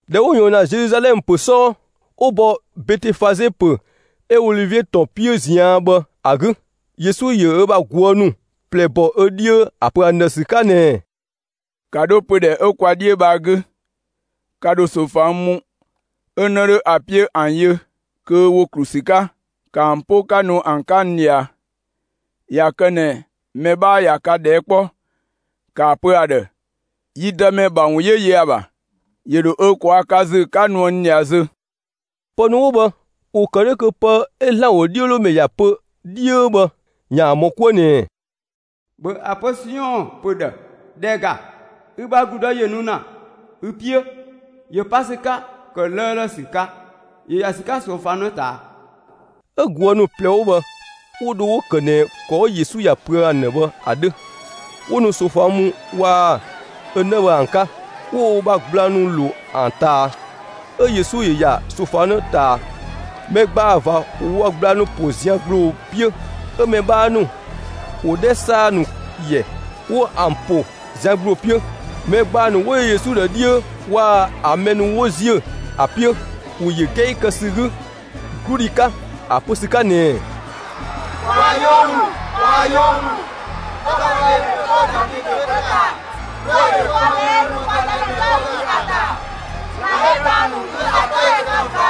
꞊Dhɛ 'wo ꞊yɔɔn ‑na Zeluzalɛmë ‑pö 'sɔɔ, 'wo bɔ Betefaze ‑pö 'ö Olivie ‑tɔn 'piö ꞊zian' bhë ‑a 'gü. Yesu ‑yö ö ‑bha ꞊guë' ‑nu ꞊plɛ bɔ ö 'dhiö ‑a ‑pö ‑an ‑dhë ‑sü 'ka ꞊nɛɛ: «‑Ka 'dho pödhɛ 'ö kwa 'dhiö bhë ‑a 'gü, ka ‑dho ꞊soofang mu 'ö‑ 'në 'dho ‑a 'piö ‑an yö kö ‑wo ‑klu ‑sü 'ka. ‑Ka ‑an 'po 'ka nu ‑an 'ka n ꞊dhia! ꞊Ya kë ꞊nɛ mɛ 'bhaa ꞊ya ka ꞊dhɛɛ' 'kpɔ, ‑kaa pö ‑a ‑dhë: ‹Yi Dëmɛ ‑bha 'wun ‑yö ‑yö ‑an ‑bha.› ‑Yö ‑dhö ö ꞊kwaa' ka ‑zü 'ka nuë n ꞊dhia zö!» Pë ‑nu 'wo bhë, ‑wo ‑kë 'dhö kö pë 'ö ‑Zlan ‑wodhiölomɛ ‑ya pö 'dhiö bhë, ‑yaan ‑mɔ 'kuë ꞊nɛɛ: ‑Bhö ‑a pö Siɔn ‑pö ‑dhë: ‑Dhɛ ‑ga, ü bha ‑gludë ‑yö nu ‑na ü 'piö, ‑yö pa ‑sü 'ka ‑kë 'lëëlë ‑sü 'ka; 'yö ‑ya ‑sü 'ka ꞊soofang 'në ꞊taa. 'Ö ꞊guë' ‑nu ꞊plɛ 'wo bhë 'wo dho 'wo‑ ‑kë ꞊nɛ ‑kɔ 'ö Yesu ‑ya pöë ‑an ‑dhë bhë ‑a 'dhö. 'Wo nu ꞊soofang mu waa‑ ö 'në bhë ‑an 'ka, 'wo wo ‑bha gblang ‑nu ‑lo ‑an ꞊taa, 'ö Yesu ‑yö ‑ya ꞊soofang 'në ꞊taa. Mɛ ‑gbaa ꞊va ‑wo wo ‑bha gblang ‑nu ‑po zian ‑gbloo 'piö, 'ö mɛ 'bhaa ‑nu ‑wo 'dhɛ ‑saa ‑nu ‑yɛ, 'wo ‑an ‑po zian ‑gbloo 'piö. Mɛ ‑gbaa ‑nu 'wo yö Yesu ‑dhë 'dhiö waa‑ ‑an mɛ ‑nu 'wo ‑ziö ‑a 'piö, ‑wo ‑yö 'gɛi kë ‑sü 'gü 'gludhi 'ka ‑a pö ‑sü 'ka ꞊nɛɛ: «Kwaa‑ 'yoo ‑mü! Kwaa‑ 'yoo ‑mü! 'Tɔbhɔdhe ‑yö 'to Davidö gbö ‑ta! 'Dhuë‑ ‑yö 'kpɔ mɛ 'ö nu kwa Dëmɛ 'tɔ 'gü ‑a ‑ta! ‑Zlan 'ö dhang‑ ‑nu 'gü ‑a 'tɔ ‑yö kë ꞊va!»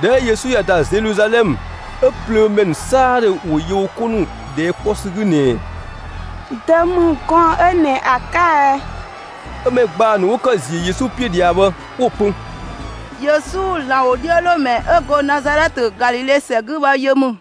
꞊Dhɛ 'ö Yesu ‑ya ‑da Zeluzalɛmë, 'ö plöömɛ ‑nu 'saadhö ‑wo yö wo 'ko ‑nu ꞊dhɛɛ' 'kpɔ ‑sü 'gü ꞊nɛɛ: «Dö ‑mü gɔɔn‑ 'ö ꞊nɛ ‑a 'ka ɛ?» 'Ö mɛ ‑gbaa ‑nu 'wo kë ziö Yesu 'piö ꞊dhia bhë, 'wo‑ pö: «Yesu, ‑Zlan ‑wodhiölomɛ 'ö 'go Nazalɛtë, Galile ‑sɛ 'gü bhë yö ‑mü!»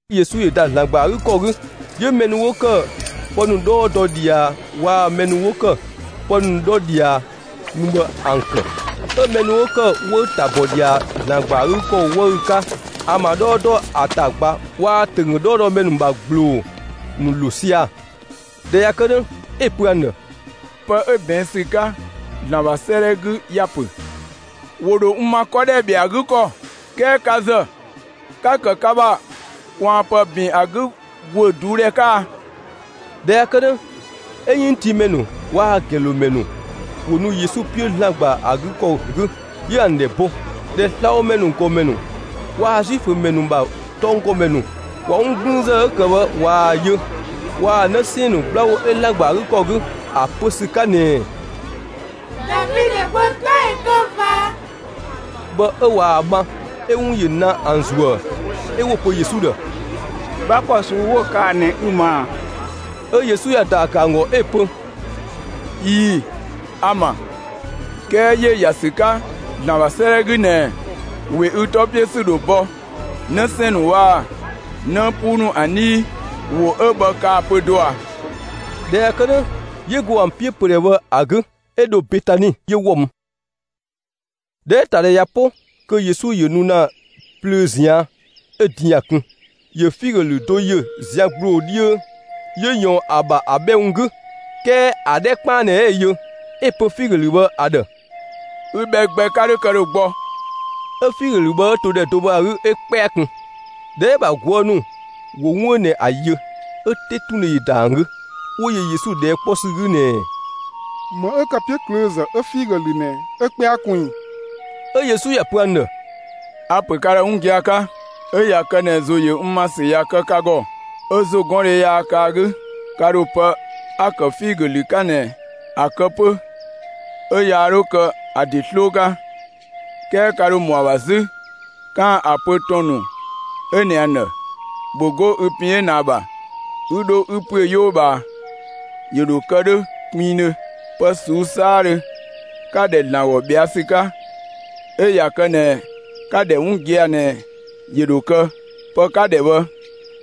Yesu ‑yö ‑da ‑Zlan ‑gba ‑a 'gü ‑kɔ 'gü, 'yö mɛ ‑nu 'wo ‑kë pë ‑nu 'dhɔɔ dɔ ꞊dhia waa‑ mɛ ‑nu 'wo ‑kë pë ‑nu 'dhɔ ꞊dhia mü bhë 'ö ‑an ‑kë, 'ö mɛ 'wo ‑kë 'wëü‑ ‑ta ‑bɔ ꞊dhia ‑Zlan ‑gba ‑a 'gü ‑kɔ 'wëü‑ 'ka ‑an ‑bha 'dhɔɔ dɔ ‑a ‑ta ꞊gba waa‑ ‑tönggö 'dhɔɔdɔmɛ ‑nu ‑bha ‑gbloo ‑nu ‑lo sia‑. ꞊Dhɛ ꞊ya kë 'dhö, 'ö‑ pö ‑an ‑dhë: «Pë 'ö ꞊bɛɛn' ‑sü 'ka ‑Zlan ‑bha 'sëëdhɛ 'gü ‑ya ‑pö: ‑Wo ‑dho n ‑ma 'kɔ ‑dhɛ ‑bhɛa ‑a 'gü ‑kɔ, 'kɛɛ ka ‑zë, 'ka‑ ‑kë ka ‑bha ꞊kwaanpë ‑bin ‑a 'gü ‑guö ꞊duudhɛ 'ka!» ꞊Dhɛ ꞊ya kë 'dhö, 'ö 'yënngtiimɛ ‑nu waa‑ ‑gɛnlomɛ ‑nu ‑wo ‑nu Yesu 'piö ‑Zlan ‑gba ‑a 'gü ‑kɔ 'gü, 'yö ‑an ‑dhɛ bo. ꞊Dhɛ slabhomɛ ‑nu ‑gɔmɛ ‑nu waa‑ Zuifö ‑mɛ ‑nu ‑bha tɔnggɔmɛ ‑nu ꞊wa 'wun 'gblüünzë 'ö‑ ‑kë bhë ꞊waa‑ yö waa‑ 'në 'sɛɛn‑ ‑nu 'gbla ‑wo 'ö ‑Zlan ‑gba ‑a 'gü ‑kɔ 'gü ‑a pö ‑sü 'ka ꞊nɛɛ «Davidö gbö 'tɔ ‑yö kë ꞊va!» bhë 'ö ꞊waa‑ ma, 'ö 'wun ‑yö ‑na ‑an ‑zuë. 'Ö 'wo‑ pö Yesu ‑dhë: «'Gbla ‑kɔ ꞊suu'‑ 'wo‑ kaa‑ ꞊nɛ, 'ü‑ ‑ma ‑a?» 'Ö Yesu ‑ya ‑daa ‑kë ‑an ‑gɔ 'ö‑ pö: «꞊Ii‑, a‑ ‑ma, 'kɛɛ ‑yö ‑ya ‑sü 'ka ‑Zlan ‑bha 'sëëdhɛ 'gü ꞊nɛɛ: ‑We ü 'tɔ 'piö ‑sü ‑dho bɔ 'në 'sɛɛn‑ ‑nu waa‑ 'në 'puu ‑nu ‑an 'dhii. ‑Wo 'ö bhë kaa‑ pö do ꞊a?» ꞊Dhɛ ꞊ya kë 'dhö, 'yö go ‑an 'piö pödhɛ bhë ‑a 'gü, 'ö dho Betani, 'yö ‑wɔ mü. ꞊Dhɛ 'ö‑ ‑ta ‑dhɛ ꞊ya 'po, kö Yesu ‑yö nu ‑na plöö ꞊zian', 'ö din ‑ya ‑kun. ‑Yö figö ‑lü do ‑yö zian ‑gbloo 'dhiö, 'yö ꞊yɔɔn ‑a ‑bha ‑a bhɛ ‑wun 'gü, 'kɛɛ ‑a 'dhɛ 'kpaan ꞊nɛ 'ö‑ yö. 'Ö‑ pö figö ‑lü bhë ‑a ‑dhë: «Ü bhɛ gbɛ 'ka 'dhö kë ‑dhö gbɔ!» 'Ö figö ‑lü bhë 'ö to ‑dhɛ do bhë ‑a 'gü 'ö 'kpɛa kun. ꞊Dhɛ 'ö‑ ‑bha ꞊guë' ‑nu ‑wo 'wun 'ö ꞊nɛ ‑a ‑yö, 'ö 'tetundhe ‑yö ‑da ‑an 'gü, 'wo yö Yesu ꞊dhɛɛ' 'kpɔ ‑sü 'gü ꞊nɛɛ: «‑Më 'ö ‑kë 'piöklöözë 'ö figö ‑lü ꞊nɛ 'ö 'kpɛa kun ꞊i?» 'Ö Yesu ‑ya pö ‑an ‑dhë: «A‑ ‑pö ka ‑dhë 'wun gia‑ 'ka: 'Ö ꞊ya kë ꞊nɛ ‑zo ‑yö n ‑ma ‑sü ꞊ya kë ka ‑gɔ, 'ö ‑zogɔndhe yaa kë ‑a 'gü, ka ‑dho pë 'a‑ ‑kë figö ‑lü 'ka ꞊nɛ, ‑a kë 'pö 'ö yaa 'dhö kë ‑a ‑de 'sloo 'ka, 'kɛɛ ka ‑dho ‑mɔ ‑a ‑bha 'zü 'kaan‑ ‑a pö ‑tɔn 'ö ꞊nɛ ‑a ‑dhë: ‹‑Bhö 'go ü pin 'ö ꞊nɛ ‑a ‑bha 'ü 'dho 'ü ‑püö 'yoo ꞊bhaa!› ‑Yö ‑dho kë 'dhö 'gbɛɛdhö. Pë ꞊suu'‑ 'saadhö 'ka‑ ‑dhɛ ‑Zlan ‑gɔ ꞊bhɛa' ‑sü 'ka, 'ö ꞊ya kë ꞊nɛ 'ka‑ ‑dhɛ 'wun gia‑ ꞊nɛ, ‑yö ‑dho kë, pë 'ka‑ ‑dhɛ bhë,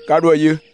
ka ‑dho ‑a yö!»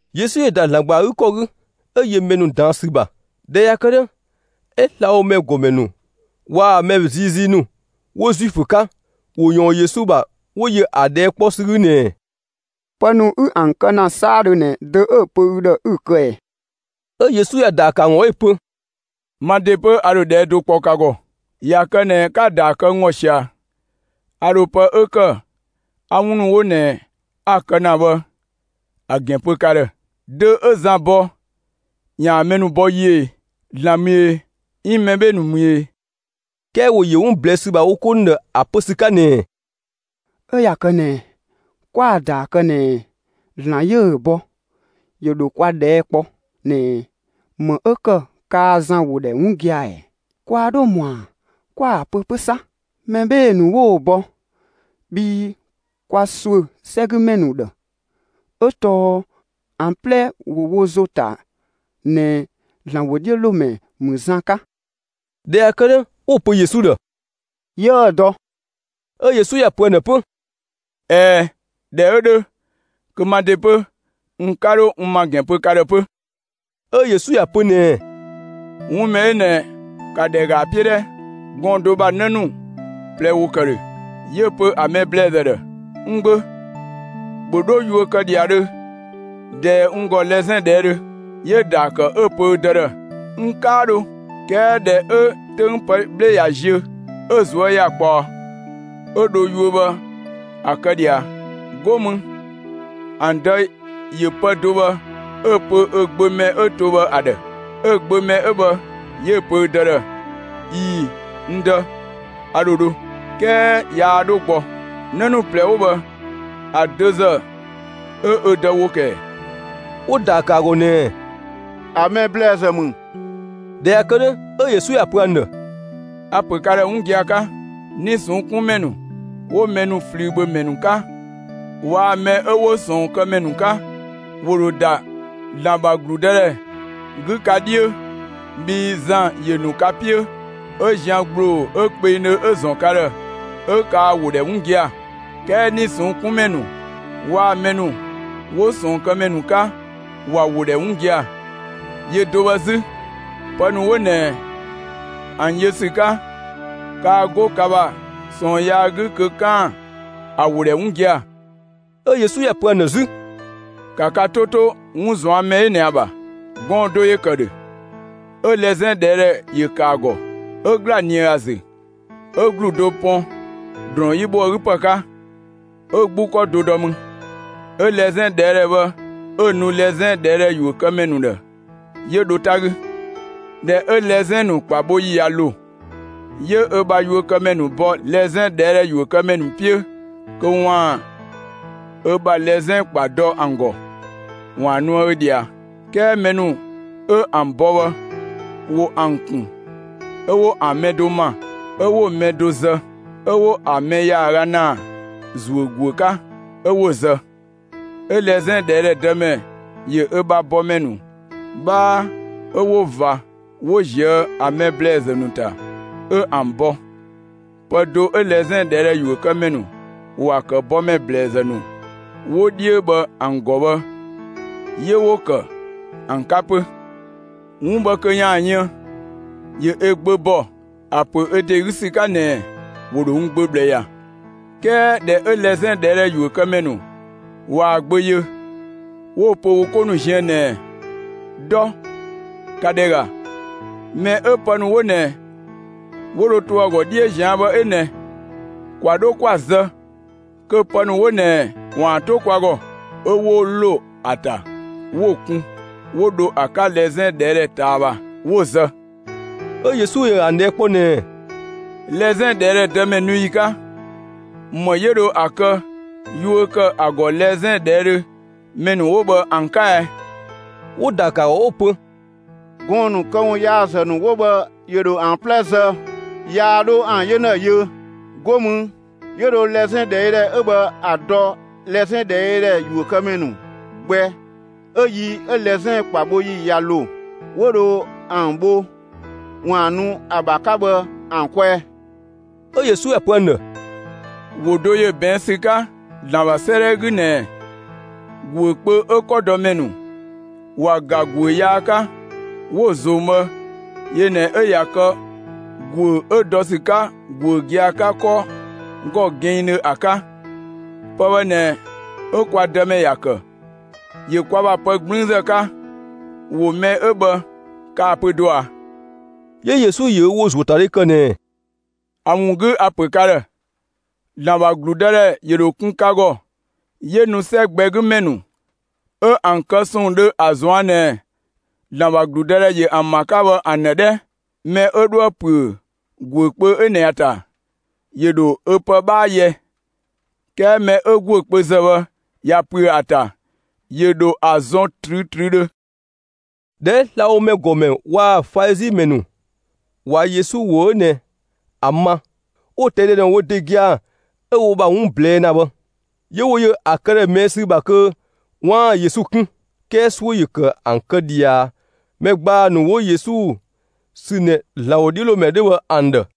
Yesu ‑yö ‑da ‑Zlan ‑gba ‑a 'gü ‑kɔ 'gü, 'ö yö mɛ ‑nu ꞊daan' ‑sü ‑bha. ꞊Dhɛ ꞊ya kë 'dhö, 'ö slabhomɛ ‑gɔmɛ ‑nu waa‑ mɛ ziizii ‑nu 'wo Zuifö 'ka, ‑wo ‑yɔɔn Yesu ‑bha, 'wo yö ‑a ꞊dhɛɛ' 'kpɔ ‑sü 'gü ꞊nɛɛ: «Pë ‑nu 'ü ‑an kë ‑na 'saadhö ꞊nɛ dö 'ö‑ pö ü ‑dhë 'ü‑ kë ꞊ɛɛ?» 'Ö Yesu ‑ya ‑daa ‑kë ‑an ‑gɔ 'ö‑ pö: «Ma ‑de 'pö, a ‑dho ꞊dhɛɛ' do kpɔ ka ‑gɔ. ꞊Ya kë ꞊nɛ 'ka‑ ‑daa kë n ‑gɔ ꞊sia, a ‑dho pë 'ö ‑kë 'a 'wun ‑nu 'wo ꞊nɛ 'a‑ kë ‑na bhë ‑a ‑gɛn pö ka ‑dhë. Dö 'ö Zan bɔ ‑yaan mɛ ‑nu ‑bɔ yiö ꞊e? ‑Zlan ‑mü e, 'iin mɛ 'bhee‑ ‑nu ‑mü e?» 'Kɛɛ ‑wo ‑yö 'wun ꞊blɛɛ' ‑sü ‑bha wo 'ko ‑dhë ‑a pö ‑sü 'ka ꞊nɛɛ: «'Ö ꞊ya kë ꞊nɛ, 'kwa‑ ‑daa kë ꞊nɛɛ: ‹‑Zlan 'yö‑ bɔ›, ‑yö ‑dho kwa ꞊dhɛɛ' kpɔ ꞊nɛɛ: ‹‑Më 'ö ‑kë kaa Zan ‑wo ‑dhɛ 'wun gia‑ ‑ɛ?› Kwaa 'dho ‑mɔa 'kwa‑ pö 'pö 'sa: ‹Mɛ 'bhee‑ ‑nu 'wo‑ bɔ›; bhii kwa ‑suö 'sɛgümɛ ‑nu ‑dhë, 'ö tɔɔ ‑an 'plɛ ‑wo wo ‑zo ‑ta ꞊nɛ ‑Zlan ‑wodhiölomɛ ‑mü Zan 'ka.» ꞊Dhɛ ꞊ya kë 'dhö, 'wo‑ pö Yesu ‑dhë: «'Yiëë‑ dɔ.» 'Ö Yesu ‑ya pö ‑an ‑dhë 'pö: «꞊Ɛɛ, ꞊dhɛ 'ö 'dhö, kö ma ‑de 'pö, n 'ka 'dho n ‑ma ‑gɛn pö ka ‑dhë 'pö.» 'Ö Yesu ‑ya pö ꞊nɛɛ: «'Wun mɛ 'ö ꞊nɛ ka ‑dhɛ ‑ga ‑a 'piö 'dhɛ: Gɔɔn‑ do ‑bha 'në ‑nu ꞊plɛ ‑wo ‑kë ‑dhö, 'yö‑ pö ‑a mɛ ‑blɛɛzë ‑dhë: ‹N gbö, ‑bhö 'dho yuö kë ‑dhiadhö ꞊dɛɛ n ‑gɔ lɛzɛn ꞊dhɛɛdhö!› 'Yö‑ ‑daa ‑kë 'ö‑ pö ö dë ‑dhë: ‹N 'kaa dho.› 'Kɛɛ ꞊dhɛ 'ö 'töng pë 'bhle ꞊ya ziö, 'ö‑ ꞊zuö' ꞊ya ꞊kpaɔ, 'ö dho yuö bhë ‑a kë ꞊dhia. 'Go mü ‑an dë ‑yö pë do bhë 'ö‑ pö ö gbö mɛ 'ö to bhë ‑a ‑dhë. Ö‑ gbö mɛ 'ö bhë 'yö‑ pö ö dë ‑dhë: ‹꞊Ii‑, n dë, a ‑dho dho›, 'kɛɛ yaa 'dho gbɔ. 'Në ‑nu ꞊plɛ 'wo bhë ‑a dö ‑zë 'ö ö dë ‑wo ‑kë ‑ɛ?» 'Wo‑ ‑daa ‑kë ‑a ‑gɔ ꞊nɛɛ: «‑A mɛ ‑blɛɛzë ‑mü.» ꞊Dhɛ ꞊ya kë 'dhö, 'ö Yesu ‑ya pö ‑an ‑dhë: «A‑ ‑pö ka ‑dhë 'wun gia‑ 'ka: 'Nii‑ ꞊sɔnng' 'kun ‑mɛ ‑nu 'wo mɛ ‑nu ꞊flüübhömɛ ‑nu 'ka, waa‑ mɛ 'ö 'wo ꞊sɔɔnkëmɛ ‑nu 'ka ‑wo ‑dho ‑da ‑Zlan ‑bha ‑gludëdhɛ 'gü ka 'dhiö. Bhii Zan ‑yö ‑nu ka 'piö, 'ö zian ‑gbloo 'ö kpengdhö 'ö‑ ‑zɔn ka ‑dhë, 'ö kaa‑ ‑wo ‑dhɛ 'wun gia‑, 'kɛɛ 'nii‑ ꞊sɔnng' 'kun ‑mɛ ‑nu waa‑ mɛ ‑nu 'wo ꞊sɔɔnkëmɛ ‑nu 'ka ‑wa ‑wo ‑dhɛ 'wun gia‑. Yö do bhë 'zü, pë ‑nu 'wo ꞊nɛ ‑an yö ‑sü 'ka, kaa 'go ka ‑bha ꞊sɔɔn yaa 'gü kö 'kaan‑ ‑a ‑wo ‑dhɛ 'wun gia‑.» 'Ö Yesu ‑ya pö ‑an ‑dhë 'zü: «‑Ka ka 'to 'to, 'wun ꞊zuan' mɛ 'ö ꞊nɛ ‑a ‑bha: Gɔɔn‑ do ‑yö ‑kë ‑dhö, 'ö lɛzɛn ꞊dhɛɛdhɛ ‑yö ‑kë ‑a ‑gɔ. 'Ö ‑gla ꞊nië ‑a ‑zü, 'ö ‑glu do pɔn ‑drɔɔn 'yi bho ‑a 'gü ‑pë 'ka, 'ö 'gbu ‑kɔ do ‑dɔ mü; 'ö lɛzɛn ꞊dhɛɛdhɛ bhë 'ö‑ nu lɛzɛn ꞊dhɛɛdhɛ ‑yuökëmɛ ‑nu ‑dhë, 'yö dho 'ta 'gü. ꞊Dhɛ 'ö lɛzɛn ‑nu ‑kpa bho ‑yi ꞊ya ‑lo, 'yö ö bha yuökëmɛ ‑nu bɔ lɛzɛn ꞊dhɛɛdhɛ ‑yuökëmɛ ‑nu 'piö kö ‑waan ö bha lɛzɛn ‑kpa dɔ ‑an ‑gɔ, ‑waan nuë ö ꞊dhia. 'Kɛɛ mɛ ‑nu 'ö ‑an bɔ bhë ‑wo ‑an ‑kun. 'Ö 'wo ‑an mɛ do ‑ma, 'ö 'wo‑ mɛ do zë, 'ö 'wo ‑an mɛ ‑yaaga ‑naa ‑zuö ‑guö 'ka; 'ö 'wo‑ zë. 'Ö lɛzɛn ꞊dhɛɛdhɛ dëmɛ ‑yö ö bha bɔmɛ ‑nu 'bhaa 'ö 'wo ꞊va 'wo ꞊zië' ‑a mɛ ‑blɛɛzë ‑nu ‑ta, 'ö ‑an bɔ. Pë do 'ö lɛzɛn ꞊dhɛɛdhɛ ‑yuökëmɛ ‑nu ‑wa ‑kë bɔmɛ ‑blɛɛzë ‑nu 'wo 'dhiö bhë ‑an ‑gɔ bhë, 'yö 'wo‑ kë ‑an 'ka 'pö. 'Wun bhë kö ‑yaan yën, ‑yö ö gbö ‑bɔ ‑a ‑pö ö ‑de 'gü ‑sü 'ka ꞊nɛɛ: ‹‑Wo ‑dho n gbö ꞊bhlë ‑ya.› 'Kɛɛ ꞊dhɛ 'ö lɛzɛn ꞊dhɛɛdhɛ ‑yuökëmɛ ‑nu ꞊waa‑ gbö yö, 'wo‑ pö wo 'ko ziën ꞊nɛɛ: ‹Dɔ, ‑ka ‑dhɛ ‑ga, mɛ 'ö pë ‑nu 'wo ꞊nɛ 'wo dho to ‑a ‑gɔ 'dhiö ꞊zian' bhë 'ö ꞊nɛ! ‑Kwa 'dho 'kwa‑ zë kö pë ‑nu 'wo ꞊nɛ ‑waan 'to kwa ‑gɔ!› 'Ö 'wo ‑lo ‑a ‑ta, 'wo‑ kun, 'wo dho ‑a 'ka lɛzɛn ꞊dhɛɛdhɛ ꞊taa ‑bha, 'wo‑ zë.» 'Ö Yesu ‑yö ‑an ꞊dhɛɛ' kpɔ ꞊nɛɛ: «Lɛzɛn ꞊dhɛɛdhɛ dëmɛ nu ‑yi 'ka, ‑më 'ö dho ‑a kë yuö ‑kë ‑a ‑gɔ lɛzɛn ꞊dhɛɛdhö ‑mɛ ‑nu 'wo bhë ‑an 'ka ɛ?» 'Wo‑ ‑daa ‑kë ‑a ‑gɔ 'wo‑ pö: «Gɔɔn‑ ‑nu këwunyaazë ‑nu 'wo bhë ‑yö ‑dho ‑an 'plɛ zë, yaa 'dho ‑an 'yena yö; 'go mü, 'yö dho lɛzɛn ꞊dhɛɛdhɛ 'ö bhë ‑a dɔ lɛzɛn ꞊dhɛɛdhɛ ‑yuökëmɛ ‑nu gbɛ 'ö yi 'ö lɛzɛn ‑kpa bho ‑yi ꞊ya ‑lo, 'wo dho ‑an bho ‑waan nu ‑a ‑bha 'ka bhë ‑an kwɛɛ.» 'Ö Yesu ‑ya pö ‑an ‑dhë: «‑Wo do ‑yö ꞊bɛɛn' ‑sü 'ka ‑Zlan ‑bha 'sëëdhɛ 'gü ꞊nɛɛ: ‑Guö kpö 'ö 'kɔdɔmɛ ‑nu ‑wa ‑ga ‑guö yaa 'ka, 'wo‑ ꞊zong' bhë yö ꞊nɛ 'ö ꞊ya kë ‑guö 'ö dɔ ‑sü 'ka ‑guö gia‑ 'ka 'kɔ ‑gɔ kpinngdhö ‑a 'ka. Pë bhë ꞊nɛ 'ö kwa Dëmɛ ‑ya ‑kë; ‑yö kwa ‑bha pë 'gblüünzë 'ka. ‑Wo mɛ 'ö bhë kaa‑ pö do ‑a?» 'Yö Yesu ‑yö ö ‑wo ‑zuö ‑a ‑ta dhe ‑kë ꞊nɛɛ: «‑A ‑wun 'gü a‑ ‑pö ka ‑dhë: ‑Zlan ‑bha ‑gludëdhɛ ‑yö ‑dho kun ka ‑gɔ, 'yö nu 'sɛ gbɛ 'gü ‑mɛ ‑nu 'ö ‑an kë ‑sɔɔn dhö ‑a ꞊zuan' ꞊nɛ ‑Zlan ‑bha ‑gludëdhɛ ‑yö ‑an ‑bha 'ka bhë ‑an ‑dhë 'dhɛ. Mɛ 'ö 'dhoë‑ ‑püö ‑guö kpö 'ö ꞊nɛ ‑a ‑ta, ‑yö ‑dho ö pë 'bhaa yɛ; 'kɛɛ mɛ 'ö ‑guö kpö ‑zë bhë ꞊ya ‑püö ‑a ‑ta, ‑yö ‑dho ‑a zɔn ꞊trüütrüüdhö.» ꞊Dhɛ 'ö slabhomɛ ‑nu ‑gɔmɛ waa‑ Falizi ‑mɛ ‑nu, ꞊wa Yesu ‑wo 'ö ꞊nɛ ‑a ma, 'wo‑ ꞊tɛi' dɔ ꞊nɛ wo ‑de gia‑ 'ö wo ‑bha 'wun ꞊blɛɛ' ‑na bhë. 'Yö 'wo yö ‑a këdhɛ ꞊mɛɛ' ‑sü ‑bha kö 'waan‑ Yesu 'kun, 'kɛɛ 'suö ‑yö ‑kë ‑an kë ꞊dhia mɛ ‑gbaa ‑nu 'wo Yesu sü ꞊nɛ ‑Zlan ‑wodhiölomɛ 'dhö bhë ‑an ‑dhë.